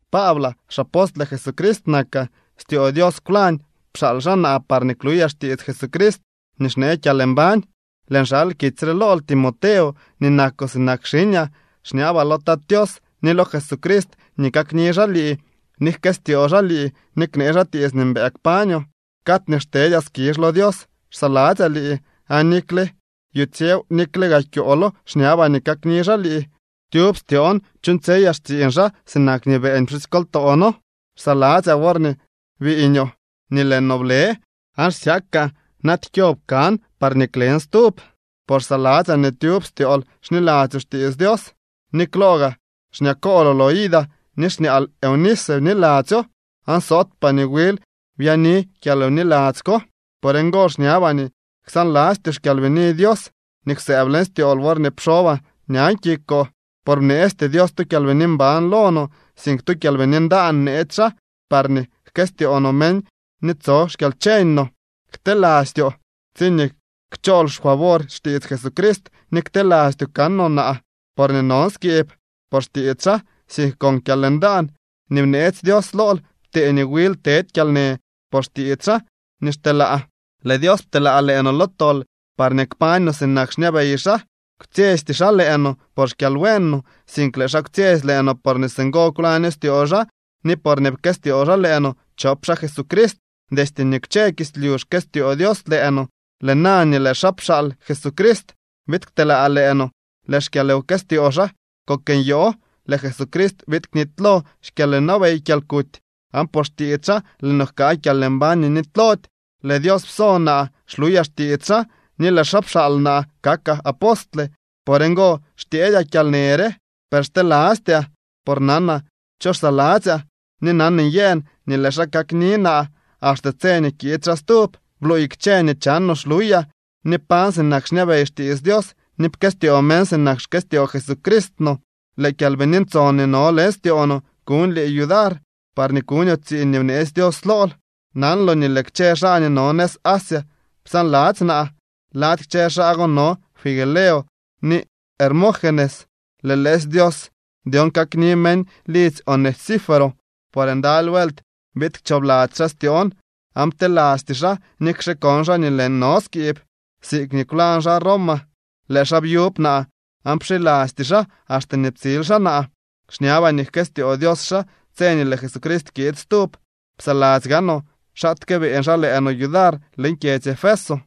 Paablaa, xapostle Jesucrist nakaa, styoo Dios kwlañ pxaal xaa naa parñee kluyaa xtiits Jesucrist nii xnee kyalmbañ. Lëën xal kitsy re lool, Timoteo nii nakoo sinak xiñaa. Xñabaa lo Tat Tios ni lo Jesucrist nii kakni xaa lii, ni jkëstyoo xaa lii, ni knee xaa tiits nii mbëë kpañoo. Cad nii xtedyaa skizh lo Dios xsaladzyaa lii aan nikle yutsyew nikle gaa kyoolo xñabaa nii kakni xaa lii, tyub styoon chuuñtsyeyaa xtsiiñ xaa sinak nii beeñ pxusykoltoo noo. Xsaladzyaa worñee biiñoo, nii lëë no blë aan xsyakaa naaty kyob kan parñee klen stub. Por xsaladzyaa nii tyub styool xniladzyoo xtiits Dios. Ni klo gaa xñakooloo Loida ni xñaal Eunice, bniladzyoo aan sootpaa nii wil byaani kyalwniladzy ko. Por ngo xñabaa nii ksaanlastyoo xKyalbini Dios nii kwsëëb leñ styool worñee pxobaa ñan kikoo. Por bneesty Dios tu kyalbini mban lo no, sink tu kyalbini ndaan bneetsy xaa parñee jkëstyoo no meñ ni tso xkyalcheñ no. Ktelastyoo tsiñee kchool xfavor xtiits Jesucrist ni ktelastyoo kanoo naa porñee non skiib por xtiits xaa, sink con kyalndaan nii bneetsy Dios lool ptee nii wil tedy kyalnë por xtiits xaa nii xteelaa. Lëë Dios pteelaa lëë no lo tol parñee kpañ no sinak xñabey xaa. Kwtsyesty xaa lëë no por xkyalbuen no, sink lëë xaa kwtsyetsy lëë no porñee singo kwlaño styoo xaa ni porñee pkëstyoo xaa lëë no chop xaa Jesucrist. Destye nii kwche kislyu xkëstyoo Dios lëë no. Lëë na nii lëë xaa pxaal Jesucrist biid kteelaa lëë no, lëë xkyalwkëstyoo xaa kok nyoo. Lëë Jesucrist biid knitylo xkyalwnabey kyalkuty aan por xtiits xaa lëë no jkaa kyalmbañ nii nitylody. Lëë Dios psonaa kluyaa xtiits xaa, ni lëë xaa pxaal naa kakaa apostle. Por ngo xtyeedyaa kyalnë re. Per xtelastyaa por nanaa cho xsaladzyaa. Ni nan nyëën nii lëë xaa kakni naa axte tse nii kiid xaa stub. Bluuy kchë nii chanoo xluyaa, ni pañ sinak xñabey xtiits Dios, ni pkëstyoo meñ sinak xkëstyoo Jesucrist no. Lëë Kyalbini Ntson nii no leñ styoo no kuñ lii yudar, parñee kuñoo tsiiñ nii bneetsy Dios lool. Nanloo nii lëë kchë xaa nii no nëz Asia psaanladzy naa. Lady kchë xaa go no Figelo ni Hermógenes. Lëë lëësy Dios dyon kakni meñ lidzy Onesíforo, por ndaly vuelt biid kchoobladzy xaa styoon aan ptelasty xaa nikxe kon xaa nii lëën no skiib. Siikñee kwlañ xaa Roma, lëë xaa byub naa aan pxilasty xaa, axte nii ptsil xaa naa. Xñabaa nii jkëstyoo Dios xaa tse nii lëë Jesucrist kiid stub. Psaladzy gaanoo xaatke beeñ xaa lëë no yudar leñ kyedzy Efeso.